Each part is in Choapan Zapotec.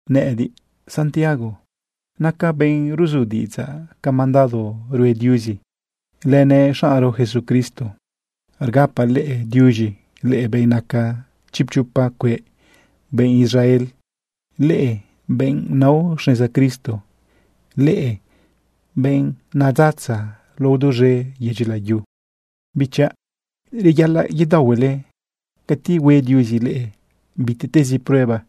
Nëꞌëdiꞌ, Santiago, nacaꞌ benꞌ ruzu diꞌidzaꞌ ca mandado rue Diuzi lënëꞌ xaꞌnro Jesucristo. Rgapaꞌ leꞌe diuz̃i, leꞌe benꞌ naca chipchopa cueꞌ benꞌ Israel, leꞌe benꞌ nao xneza Cristo, leꞌe benꞌ rdale duz̃e yedyi layu. Bichaꞌ, reyaꞌalaꞌ yedaohuele cati hue Diuzi leꞌe bitiꞌtezi prueba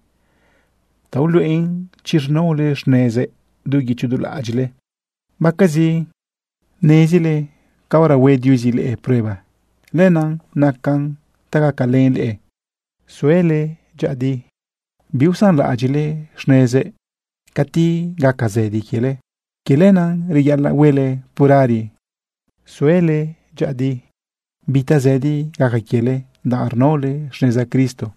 ta uluꞌen chi rnaole xnezëꞌ du guicho du laꞌadyiꞌle. Baquezi nezile caora hue Diuzi leꞌe prueba, lenaꞌ nacan ta gacalën leꞌe suele dyëꞌëdi biusanlaꞌadyiꞌle xnezëꞌ cati gaca zëdi quiele. Quie lenaꞌ reyaꞌalaꞌ huele purari suele dyëꞌëdi bi tazëdi gaca quiele danꞌ rnaole xneza Cristo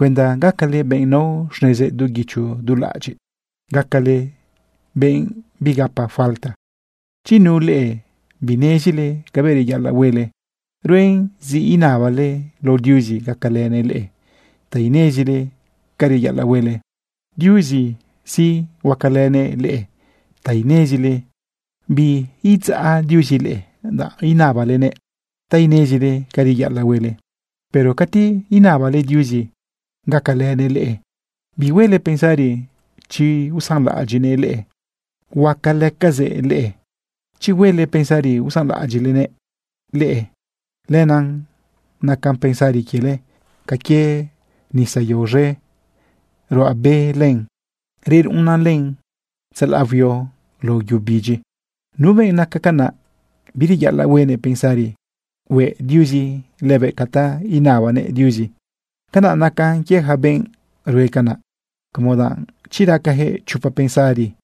cuenda gacale benꞌ nao xnezëꞌ du guicho du laꞌadyiꞌ, gacale benꞌ bigapa falta. Chi nu leꞌe binezile cabëꞌ reyaꞌalaꞌ huele, ruen zi inabale lao Diuzi gacalënëꞌ leꞌe ta inezile ca reyaꞌalaꞌ huele. Diuzi sí, huacalënëꞌ leꞌe ta inezile. Biidzaꞌ Diuzi leꞌe danꞌ inabalenëꞌ ta inezile ca reyaꞌalaꞌ huele. Pero cati inabale Diuzi gacalënëꞌ leꞌe, bihuele pensari chi usanlaꞌadyiꞌnëꞌ leꞌe, huacalëcazëꞌ leꞌe. Chi huele pensari usanlaꞌadyiꞌnëꞌ leꞌe, lenaꞌ naca pensari quiele ca quie nisa yao z̃e ruꞌa be len, reruꞌunnan len tzalaꞌ huio lao yu bidyi. Nu benꞌ naca canaꞌ, bireyaꞌalaꞌ huenëꞌ pensari hueꞌ Diuzi lëbëꞌ ca ta inabanëꞌ Diuzi. Canaꞌ naca quie yaca benꞌ rue canaꞌ, como danꞌ chi racajëꞌ chopa pensari,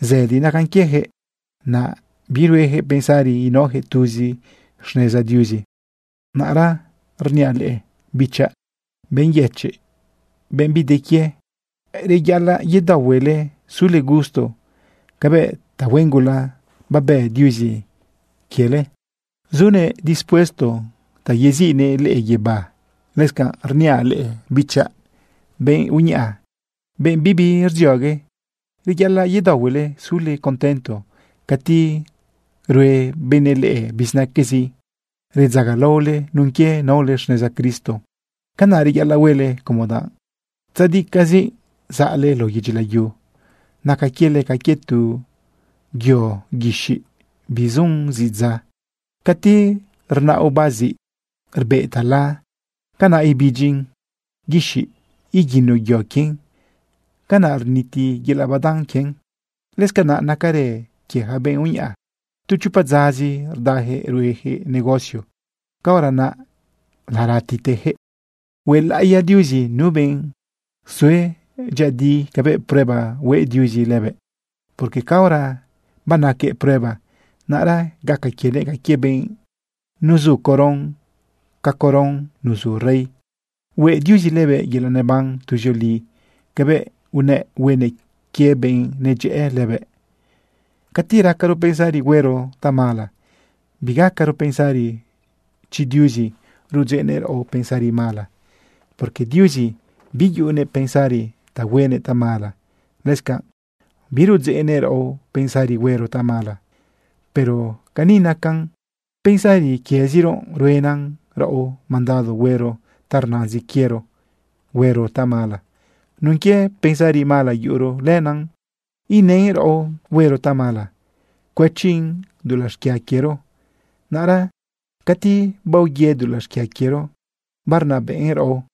zëdi nacan quiejëꞌ, naꞌ biruejëꞌ pensari inaojëꞌ tuzi xneza Diuzi. Naꞌra rniaꞌ leꞌe, bichaꞌ, benꞌ yëchiꞌ, benꞌ bi de quie: Reyaꞌalaꞌ yedaohuele sule gusto cabëꞌ tahuen gula babë Diuzi quiele sunëꞌ dispuesto ta yeziꞌnëꞌ leꞌe guibá. Lëscanꞌ rniaꞌ leꞌe, bichaꞌ, benꞌ uñaꞌa, benꞌ bibi rdziogue: Reyaꞌalaꞌ yedaohuele sule contento cati rue benëꞌ leꞌe bizinaquezi redzagalaole nun quie naole xneza Cristo. Canaꞌ reyaꞌalaꞌ huele como danꞌ tzadicaꞌzi zaꞌle lao yedyi layu. Naca quiele ca quie tu yo guixiꞌ bisun zidza. Cati rnaꞌ oba ziꞌ rbeꞌ tala, canaꞌ ibidyi guixiꞌ iguino yo quien, canaꞌ rniti yelaꞌ badan quien. Lëscanaꞌ nacarë quie yaca benꞌ uñaꞌa. Tu chopa dzazi rdajëꞌ ruejëꞌ negocio, caora naꞌ laratitejëꞌ. Huelaꞌiya Diuzi nu benꞌ sue dyëꞌëdi cabëꞌ prueba hue Diuzi lëbëꞌ, porque caora banaquëꞌ prueba, naꞌra gaca quienëꞌ ca quie benꞌ nuzu coron ca coron nuzu rey. Hueꞌ Diuzi lëbëꞌ yelaꞌ neban tuzioli cabëꞌ unëꞌ huenëꞌ quie benꞌ nadyëꞌë lëbëꞌ. Cati racaro pensari huero tamala, bigacaro pensari chi Diuzi rudzeꞌnëꞌ raꞌo pensari mala, porque Diuzi biyuꞌunëꞌ pensari ta huenëꞌ tamala, lëscanꞌ birudzeꞌnëꞌ raꞌo pensari huero tamala. Pero cani nacan: Pensari quieziro ruenan raꞌo mandado huero ta rnazin quiero huero tamala. Nun quie pensari mala yuꞌuro, lenaꞌ inën raꞌo huero tamala cuëchin dulaꞌ xquia quiero. Naꞌra cati baoyë dulaꞌ xquia quiero, barnabëꞌn raꞌo,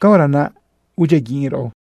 caora naꞌ udyiaguiꞌn raꞌo.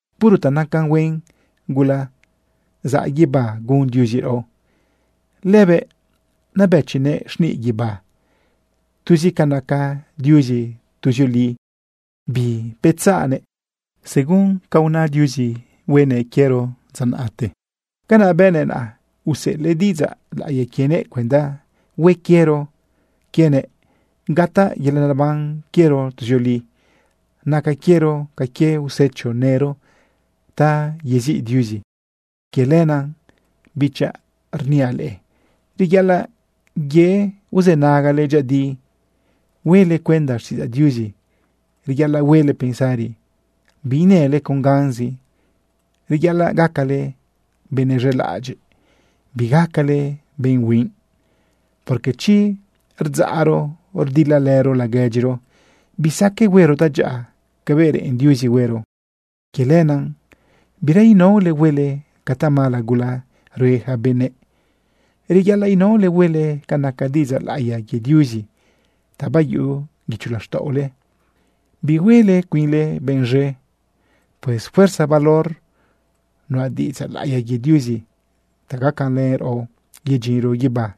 Puro ta naca huen gula zaꞌ guibá gun Diuzi raꞌo. Lëbëꞌ nabëchinëꞌ xniꞌ guibá. Tuzi ca naca Diuzi tuzioli, bibetzaꞌnëꞌ. Según ca una Diuzi huenëꞌ quiero dza naꞌte, canaꞌ bënëꞌ naꞌ. Useꞌelëꞌ diꞌidzaꞌ laꞌiya quienëꞌ cuenda hue quiero quienëꞌ gataꞌ yelaꞌ neban quiero tuzioli. Naca quiero ca quie usecho nëro ta yeziꞌ Diuzi. Quie lenaꞌ, bichaꞌ, rniaꞌ leꞌe reyaꞌalaꞌ ye uzënagale dyëꞌëdi huele cuenda xtiꞌidzaꞌ Diuzi. Reyaꞌalaꞌ huele pensari biinële con ganzi. Reyaꞌalaꞌ gacale benëꞌ z̃elaꞌadyiꞌ, bigacale benꞌ huinꞌ. Porque chi rdzaꞌro rdilalëro laguedyiro, bisaqueꞌ huero tadyaꞌa cabëꞌ reꞌen Diuzi huero. Quie lenaꞌ bira inaole huele ca tamala gula rue yaca benëꞌ. Reyaꞌalaꞌ inaole huele ca naca diꞌidzaꞌ laꞌiya quie Diuzi ta bayuꞌu guicho laxtaꞌole, bihuele cuinle benꞌ z̃e. Pues fuerza valor nuꞌa diꞌidzaꞌ laꞌiya quie Diuzi ta gacalën raꞌo yedyinro guibá.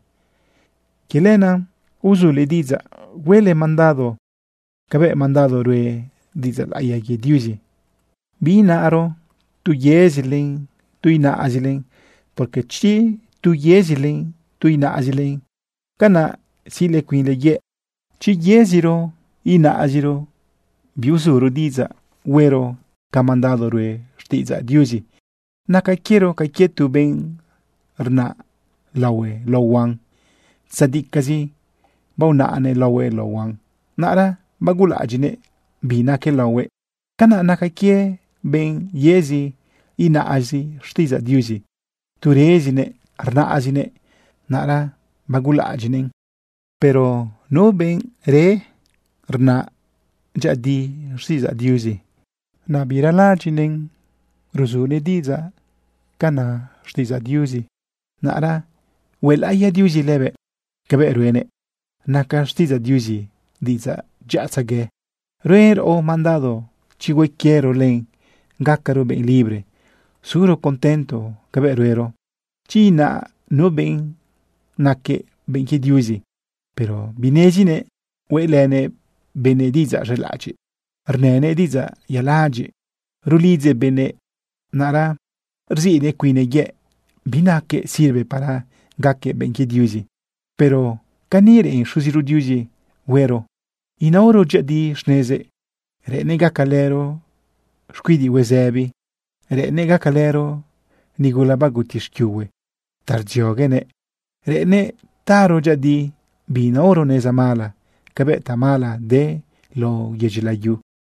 Quie lenaꞌ uzule diꞌidzaꞌ huele mandado cabëꞌ mandado rue diꞌidzaꞌ laꞌiya quie Diuzi. Biinaro tu yezilen, tu inaꞌzilen, porque chi tu yezilen, tu inaꞌzilen, canaꞌ siꞌle cuinle yëꞌ. Chi yeziro inaꞌziro biuzuro diꞌidzaꞌ huero ca mandado rue xtiꞌidzaꞌ Diuzi, naca quiero ca quie tu benꞌ rnaꞌ laohue lao huan. Tzadicaꞌzi baonaꞌnëꞌ laohuëꞌ lao huan, naꞌra bagulaꞌadyiꞌnëꞌ bi naque laohuëꞌ. Canaꞌ naca quie benꞌ yezi inaꞌzi xtiꞌidzaꞌ Diuzi. Tu rezinëꞌ rnaꞌzinëꞌ, naꞌra bagulaꞌadyiꞌnëꞌ len. Pero nu benꞌ re rnaꞌ dyëꞌëdi xtiꞌidzaꞌ Diuzi, birezaꞌlaꞌadyiꞌnëꞌn ruzunëꞌ diꞌidzaꞌ ca na xtiꞌidzaꞌ Diuzi, naꞌra huelaꞌiya Diuzi lëbëꞌ cabëꞌ ruenëꞌ. Naca xtiꞌidzaꞌ Diuzi diꞌidzaꞌ dyaꞌatzegue. Ruen raꞌo mandado chi hue quiero len gacaro benꞌ libre, suro contento cabëꞌ ruero. Chi ina nu benꞌ naquëꞌ benꞌ quie Diuzi, pero binezinëꞌ hueꞌlënëꞌ benëꞌ diꞌidzaꞌ z̃elaꞌadyiꞌ, rnënëꞌ diꞌidzaꞌ yaladyiꞌ rulidzëꞌ benëꞌ, naꞌra rziꞌnëꞌ cuinnëꞌ yëꞌ. Binaquëꞌ sirve para gaquëꞌ benꞌ quie Diuzi. Pero cani reꞌen Xuziro Diuzi huero inaoro dyëꞌëdi xnezëꞌ, reꞌennëꞌ gacalëro xcuidiꞌ huezëbi, reꞌennëꞌ gacalëro nigula baguti xquiuhue ta rdzioguenëꞌ, reꞌennëꞌ taro dyëꞌëdi biinaoro neza mala cabëꞌ tamala de lao yedyi layu.